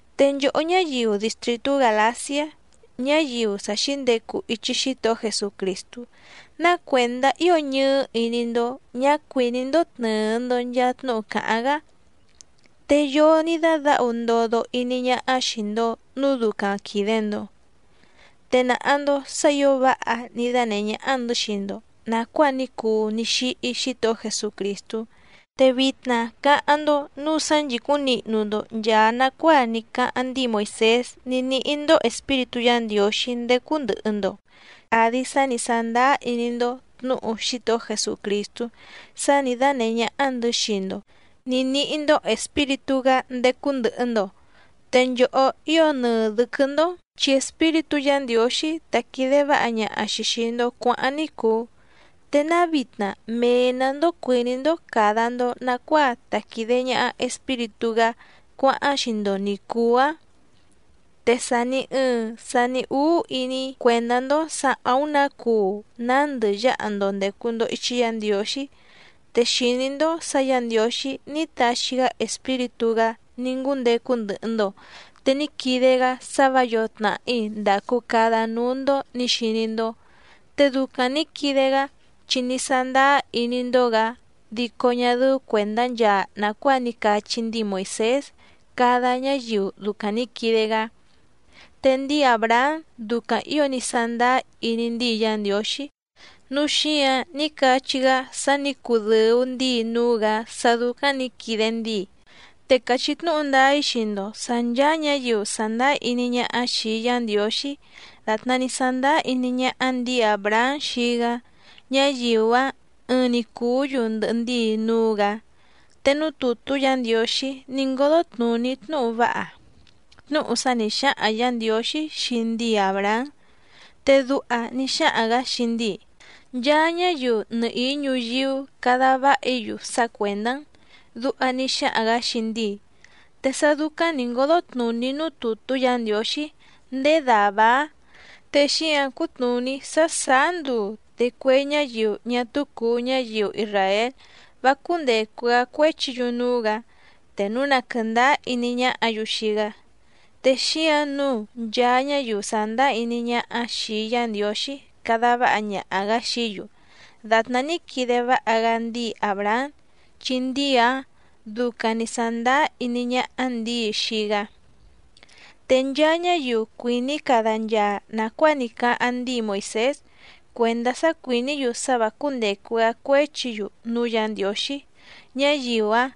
Te nchòhó ñáyiu distrìtú Gàlaciá, ñáyiu sa xǐndecu ichi Xítohó Jesucrìstú, ¿ná cuèndá ío ñɨɨ́ iní‑ndó ñǎ cuìní‑ndó tnɨ̀ɨ‑ndo nchaa tnúhu càháⁿ‑gá?, ¿te yoo ní dádǎhu ndodo iní ñáhá xìi‑ndo núu ducaⁿ quìde‑ndo? Te nàha‑ndo sá ǐo váha ní dánèhé ñáhá‑ndɨ̌ xii‑ndo nàcuáa ní cuu ní xíhí Xítohó Jesucrìstú. Te vitna cáháⁿ‑ndó nǔu sá nchìcúⁿ nihnu‑ndo nchàa nacuáa ní cáháⁿ ndíi Moìsés ní níhí‑ndó Espíritú Yǎ Ndiǒxí ndécú ndɨ̀hɨ‑ndo, àdi sá ni sàndáá iní‑ndó tnǔhu Xítohó Jesucrìstú sá nǐ dánèhé ñáhá‑ndɨ̌ xii‑ndo nǐ níhí‑ndó Espíritú‑gá ndécú ndɨ̀hɨ‑ndo. Te nchòhó ío nɨɨ dɨ̌quɨ́‑ndó chi Espíritú Yǎ Ndiǒxí tá quìde váha ñaha‑xi xìi‑ndo cuáháⁿ ní cùu. ¿Te náa vitna mee‑nǎ‑ndó cuìní‑ndó càda‑ndo nacuáa ta quìde ñaha Espíritú‑gá cuáháⁿ xii‑ndo ni cùu‑áⁿ? Te sàni ɨɨⁿ sani úú iní‑í cuèndá‑ndó sǎ àúⁿ nǎ cuu nándɨ yáha‑ndo ndècu‑ndo ichi Yá Ndiǒxí. Te xìní‑ndó sǎ Yǎ Ndiǒxí ní taxi‑gá Espíritú‑gá ní ngúndecu ndɨhɨ‑ndo, te ní quide‑gá sá vǎ yǒo tnàhí ndàcu cada núú‑ndó nǐ xiní‑ndó. Te ducaⁿ nǐ quide‑gá, chi ní sándáá iní‑ndó‑gǎ, dico ñá dɨ́ú cuèndá nchaa nàcuáa ní cachí ndíi Moìsés cada ñáyiu ducaⁿ nǐ quide‑gá. Te ndíi Àbrahám ducaⁿ ǐo ní sándáá iní ndíi Yá Ndiǒxí, núu xíǎⁿ ní cachí‑gá sá nǐ cudɨ̀u ndíi núú‑gǎ sá dúcáⁿ nǐ quide ndíi. Te càchí tnúhu ndáá‑í xii‑ndo sǎ ncháá ñǎyiu sàndáá iní ñáhá xìi Yá Ndiǒxí dàtná ní sándáá iní ñáhá ndǐi Àbrahám xii‑gá, ñáyiu‑áⁿ ɨɨⁿ‑ni cùú‑yu ndɨhɨ ndíi núú‑gǎ. Te núú tùtú Yǎ Ndiǒxí ní ngódó tnùní tnúhu váha, tnúhu sá nǐ xáhaⁿ Yǎ Ndiǒxí xii ndíi Àbrahám, te duha ní xáhaⁿ‑gǎ xii ndíi: “Nchaa ñáyiu nɨhìí ñuyíú cada váha‑í‑yu sá cuèndá‑n”, duha ní xáhaⁿ‑gǎ xii ndíi. Te sá dúcáⁿ nǐ ngódó tnùní núú tùtú Yǎ Ndiǒxí ndéé dàvá‑áⁿ, te xíǎⁿ cútnùní sá sàá nduu, te cue ñáyiu ñá túú cùu ñáyiu isràél vá cúndècu‑gá cuéchi‑yu núú‑gǎ te núu na quɨ̀ndáá iní ñáhǎ‑yu xii‑gá. Te xíǎⁿ nǔu nchaa ñáyiu sàndáá iní ñáhá xìi Yá Ndiǒxí cada váha ñaha‑gǎ xií‑yu dàtná ní quide váha‑gá ndíi Àbrahám, chi ndíi‑áⁿ ducaⁿ nǐ sándáá iní ñáhá ndǐi xii‑gá. Te nchaa ñáyiu cuìní cada nchaa nàcuáa ní cáháⁿ ndíi Moìsés cuèndá sá cuìní‑yu sá vǎ cúndècu‑gá cuéchi‑yu núú Yǎ Ndiǒxí, ñáyiu‑áⁿ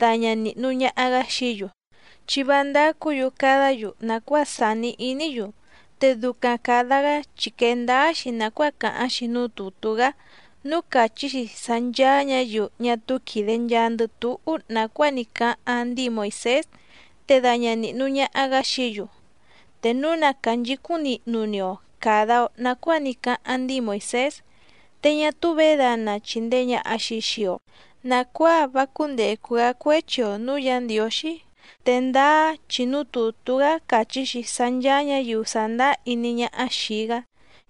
daña nìhnu ñaha‑gá xií‑yu, chi vá ndácǔ‑yu cadá‑yu nàcuáa sàni iní‑yu, te ducaⁿ càda‑gá chi quèe ndáá‑xi nàcuáa càháⁿ‑xi núú tùtú‑gá núú càchí‑xi sá ncháá ñǎyiu ñá túú quìde nchaandɨ túhú nàcuáa ní cáháⁿ ndíi Moìsés te daña nìhnu ñaha‑gá xií‑yu. Te núu na cànchicúⁿ nihnu‑ni‑o càda‑o nacuáa ní cáháⁿ ndíi Moìsés, te ñá túú vědana chìndee ñaha‑xi xii‑o nacuáa vá cúndècu‑gá cuéchi‑o nǔú Yǎ Ndiǒxí. Te ndáá chi núú tùtú‑gá càchí‑xi sá ncháá ñǎyiu sàndáá iní ñáhá xìi‑gá,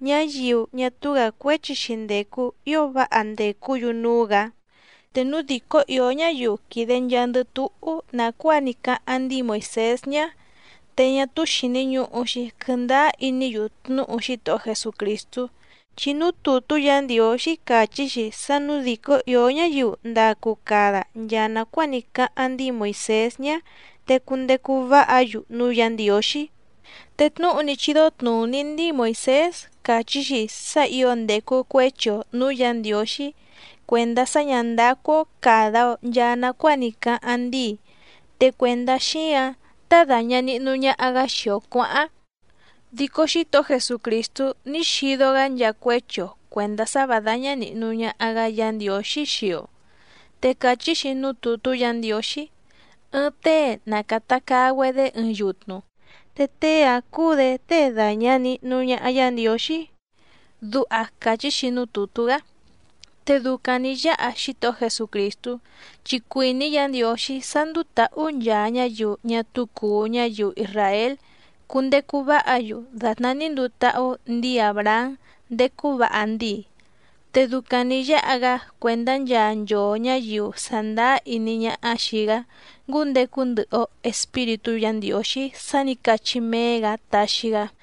ñáyiu ñá túú‑gǎ cuéchi‑xi ndècu ío váha ndècú‑yu núú‑gǎ. Te núu dìcó ìó ñáyiu quìde nchaandɨ túhú nàcuáa ní cáháⁿ ndíi Moìsés ñá, te ñá túú xìni ñuhu‑xi quɨndáá iní‑yu tnúhu Xítohó Jesucrìstú, chi núú tùtú Yǎ Ndiǒxí càchí‑xi sá nǔu dìcó ìó ñáyiu ndacu cada nchaa nàcuáa ní cáháⁿ ndíi Moìsés ñá, te cundecu váha‑yu núú Yǎ Ndiǒxí. Te tnúhu ní chídó tnùní ndíi Moìsés càchí‑xi sá ǐo ndècu cuéchi‑o nǔú Yǎ Ndiǒxí cuèndá sá ñǎ ndácú‑ó càda‑o nchaa nacuáa ní cáháⁿ ndíi, te cuèndá xíǎⁿ tá dàña nihnu ñaha‑gá xii‑o cuǎháⁿ. Dico Xítohó Jesucrìstú ní xido‑gá nchaa cuéchi‑o cuèndá sá vǎ dáñá nìhnu ñaha‑gá Yǎ Ndiǒxí xii‑o. Te càchí‑xi núú tùtú Yǎ Ndiǒxí: “Ɨɨⁿ tée na càta caa‑güedé ɨɨⁿ yutnu, te tée‑áⁿ cúú‑dě tée dàña nihnu ñaha Yá Ndiǒxí”, duha càchí‑xi núú tùtú‑gá. Te ducaⁿ nǐ yáha Xítohó Jesucrìstú, chi cuìní Yǎ Ndiǒxí sá ndùu táhú nchaa ñáyiu ñá túú cùu ñáyiu isràél cundecu váha‑yu dàtná ní nduu táhú ndǐi Àbrahám ndécú vǎha ndíi. Te ducaⁿ nǐ yáha‑gá cuèndá nchaa nchoo ñǎyiu sàndáá iní ñáhá xìi‑gá ngúndecu ndɨhɨ‑o Espíritú Yǎ Ndiǒxí sá nǐ cachí méé‑gǎ taxi‑gá.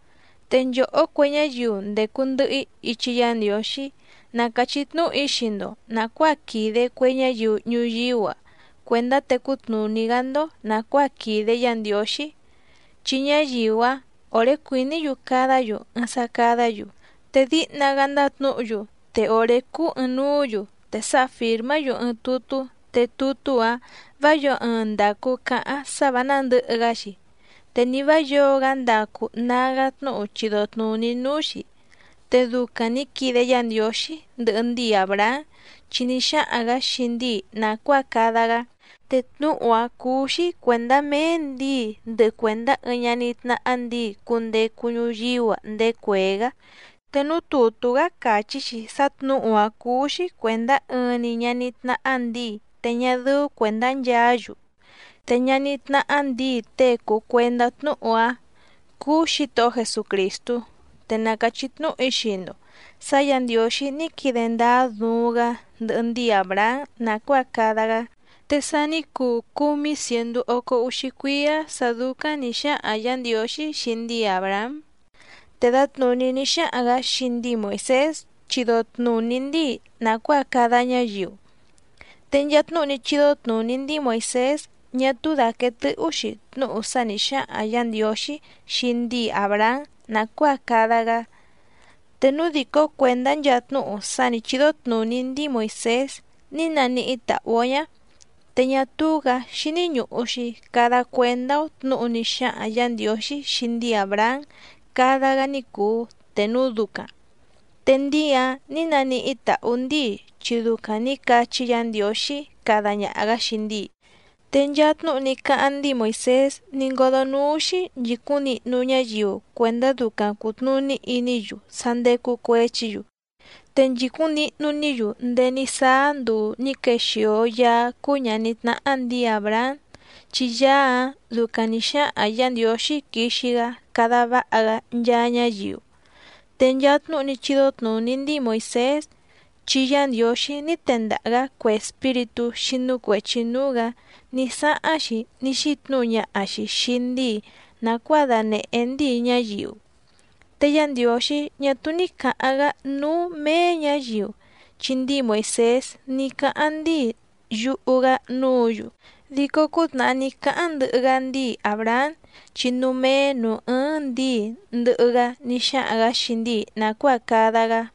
Te nchòhó cue ñáyiu ndècu ndɨhɨ‑í ichi Yá Ndiǒxí na càchí tnúhu‑í xii‑ndo nàcuáa quìde cue ñáyiu ñuyíú‑a cuèndá tecú tnùní‑gá‑ndó nàcuáa quìde Yá Ndiǒxí. Chi ñáyiu‑áⁿ òré cuìní‑yu cadá‑yu ɨɨⁿ sá cádǎ‑yu, te díhna‑gá ndátnǔhu‑yu te òré cúú ɨ̀ɨⁿnuú‑yu, te sáha fìrmá‑yu ɨɨⁿ tutú te tutú‑áⁿ vǎ yǒo ɨɨⁿ ndacu cáháⁿ sá vǎ nándɨ̌hɨ‑gá‑xi, te ni vǎ yǒo‑gá ndacu nágá tnúhu chido tnùní núú‑xí. Te ducaⁿ nǐ quide Yá Ndiǒxí ndɨhɨ ndíi Àbrahám, chi ní xáhaⁿ‑gǎ xii ndíi nàcuáa cada‑gá, te tnúhu‑áⁿ cúú‑xí cuèndá méé ndǐi ndɨhɨ cuèndá ɨɨⁿ ñaní tnáhá ndǐi cundecu ñuyíú‑a ndéé cuèé‑gá. Te núú tùtú‑gá càchí‑xi sá tnǔhu‑áⁿ cúú‑xí cuèndá ɨɨⁿ‑ni ñaní tnáhá ndǐi te ñá dɨ́ú cuèndá nchaá‑yu. Te ñaní tnáhá ndǐi tée cùu cuendá tnúhu‑áⁿ cúú Xǐtohó Jesucrìstú. Te na càchí tnúhu‑í xii‑ndo sǎ Yǎ Ndiǒxí ní quide ndáá duuⁿ‑gá ndɨhɨ ndíi Àbrahám nàcuáa cada‑gá. Te sa ní cuu cúmí cièndú ócó úxí cuíá sǎ dúcáⁿ nǐ xáhaⁿ Yǎ Ndiǒxí xii ndíi Àbrahám, te dǎtnùní ní xáhaⁿ‑gǎ xii ndíi Moìsés chido tnùní ndíi nàcuáa cada ñáyiu, te nchaa tnúhu ní chídó tnùní ndíi Moìsés ñá túú dàquee tɨ́hú‑xi tnúhu sá nǐ xáhaⁿ Yǎ Ndiǒxí xii ndíi Àbrahám nàcuáa cada‑gá. Te núu dìcó cuèndá nchaa tnúhu sá nǐ chídó tnùní ndíi Moìsés ní nàníhí tàhú‑ó ñá, te ñá túú‑gǎ xíní ñùhu‑xi cada cuendá‑ó tnǔhu ní xáhaⁿ Yǎ Ndiǒxí xii ndíi Àbrahám cada‑gá ní cùu te núu ducaⁿ. Te ndíi‑áⁿ nǐ naníhí tàhú ndíi chi ducaⁿ nǐ cachí Yǎ Ndiǒxí cada ñaha‑gǎ xii ndíi. Te nchaa tnúhu ní cáháⁿ ndíi Moìsés ní ngódó núú‑xí nchìcúⁿ nihnu ñáyiu cuèndá ducaⁿ cùtnuní iní‑yu sá ndécú cuěchi‑yu, te nchìcúⁿ nihnu‑ní‑yu ndéé ní sáá nduu nǐ quexìo Yaá cúú ñàní tnáhá ndǐi Àbrahám, chi Yaá‑áⁿ ducaⁿ nǐ xáhaⁿ Yǎ Ndiǒxí quixi‑gá cada váha‑gá nchaa ñáyiu. Te nchaa tnúhu ní chídó tnùní ndíi Moìsés, chi Yá Ndiǒxí ní tendaha‑gǎ cue espíritú xínú cuèchi núú‑gǎ ní sáháⁿ‑xi ní xítnǔhu ñaha‑xi xìi ndíi nàcuáa danèhé ndíi ñáyiu. Te Yá Ndiǒxí ñá túú ní cǎháⁿ‑gá núú méé ñǎyiu, chi ndíi Moìsés ní cáháⁿ ndíi yuhu‑gá núǔ‑yu, dico cútnàhá ní cáháⁿ ndɨhɨ‑gá ndíi Àbrahám chi núú méé nǔú ɨ́ɨ́ⁿ ndǐi ndɨhɨ‑gá ní xáhaⁿ‑gǎ xii ndíi nàcuáa cada‑gá.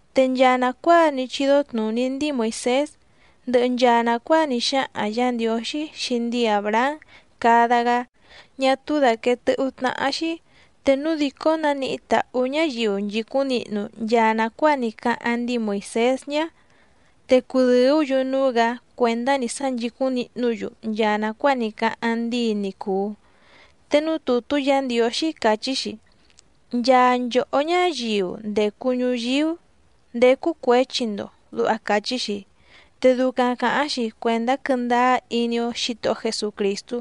Te nchaa nàcuáa ní chídó tnùní ndíi Moìsés, ndɨhɨ nchaa nàcuáa ní xáhaⁿ Yǎ Ndiǒxí xii ndíi Àbrahám cada‑gá, ñá túú dàquee tɨ́hú tnáhá‑xí. Te núu dìcó nánìhí tàhú ñáyiu nchìcúⁿ nihnu nchaa nàcuáa ní cáháⁿ ndíi Moìsés ñá te cudɨ̀ú‑yu núú‑gǎ cuèndá‑ni sá nchìcúⁿ nihnú‑yu nchaa nàcuáa ní cáháⁿ ndíi ni cùu. Te núú tùtú Yǎ Ndiǒxí càchí‑xi: “Nchaa nchòhó ñáyiu ndècu ñuyíú ndécú cuěchi‑ndo”, duha càchí‑xi. Te ducaⁿ càháⁿ‑xi cuèndá quɨ́ndáá iní‑ó Xǐtohó Jesucrìstú,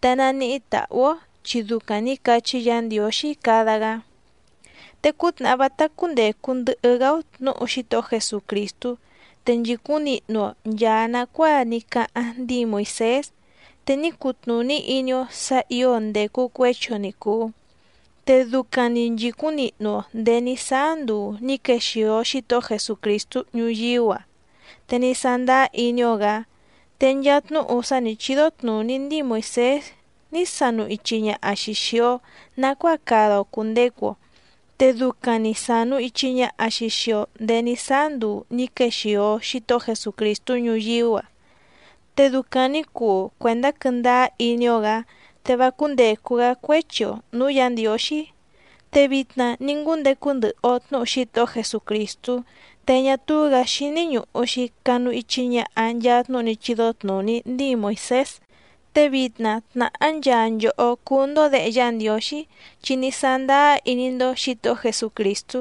te naníhí tàhú‑ó chi ducaⁿ nǐ cachí Yǎ Ndiǒxí cada‑gá. Te cútnàhá vátá cúndècu ndɨhɨ‑gá‑ó tnǔhu Xítohó Jesucrìstú, te nchìcúⁿ nihnu‑o nchàa nacuáa ní cáháⁿ ndíi Moìsés, te ní cutnùní iní‑ó sǎ ǐo ndècu cuéchi‑o ni cùu. Te ducaⁿ‑ni nchìcúⁿ nihnu‑o ndèé ní sáá nduu nǐ quexìo Xítohó Jesucrìstú ñuyíú‑a, te ní sándáá iní‑ó‑gǎ. Te nchaa tnúhu sá nǐ chídó tnùní ndíi Moìsés ní sanu ichi ñaha‑xi xìi‑o nacuáa cada‑o cùndecu‑o, te ducaⁿ‑ni sànu ichi ñaha‑xi xii‑o ndéé ní sáá nduu ní quexìo Xítohó Jesucrìstú ñuyíú‑a. Te ducaⁿ nǐ cuu cuèndá quɨ́ndáá iní‑ó‑gǎ, te vá cúndècu‑gá cuéchi‑o nǔú Yǎ Ndiǒxí. Te vitna ní ngúndecu ndɨhɨ‑o tnǔhu Xítohó Jesucrìstú, te ñá túú‑gǎ xíní ñùhu‑xi canu ichi ñaha nchaa tnúhu ní chídó tnùní ndíi Moìsés. Te vitna tnàhá nchaa nchòhó cúú‑ndó děhe Yá Ndiǒxí, chi ní sándáá iní‑ndó Xǐtohó Jesucrìstú.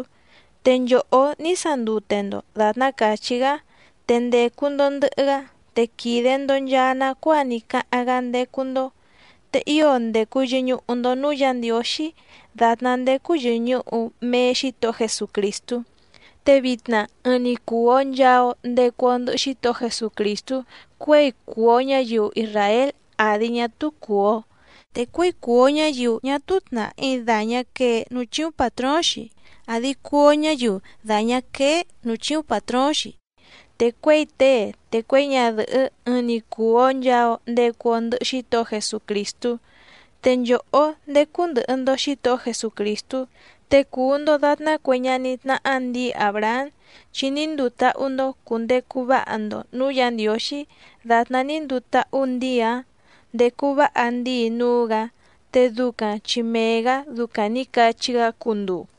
Te nchòhó ní sandute‑ndo dàtná càchí‑gá, te ndècu‑ndo ndɨhɨ‑gá, te quìde‑ndo nchaa nacuáa ní cáháⁿ‑gá ndécú‑ndó, te ío ndècu yɨñuhu‑ndo núú Yǎ Ndiǒxí dàtná ndécú yɨ̀ñuhu mee Xítohó Jesucrìstú. Te vitna ɨɨⁿ‑ni cùu‑o nchaa‑o ndecu‑o ndɨhɨ Xítohó Jesucrìstú cuěi cùu‑o ñáyiu isràél àdi ñá túú cùu‑o, te cuěi cùu‑o ñáyiu ñá túú tnàhí dàñá quee núú chíúⁿ pàtróóⁿ‑xi àdi cuu‑o ñáyiu dàñá quéé nǔú chíúⁿ pàtróóⁿ‑xi, te cuěi tée te cuěi ñadɨ̀hɨ́ ɨɨⁿ‑ni cùu‑o nchaa‑o ndecu‑o ndɨhɨ Xítohó Jesucrìstú. Te nchòhó ndécú ndɨ̀hɨ‑ndo Xítohó Jesucrìstú, te cùu‑ndo datná cue ñaní tnáhá ndǐi Àbrahám, chi ní nduu táhú‑ndó cùndecu váha‑ndo nǔú Yǎ Ndiǒxí dàtná ní nduu táhú ndǐi‑áⁿ ndécú vǎha ndíi núú‑gǎ, te ducaⁿ chi mee‑gǎ ducaⁿ nǐ cachí‑gá cunduu.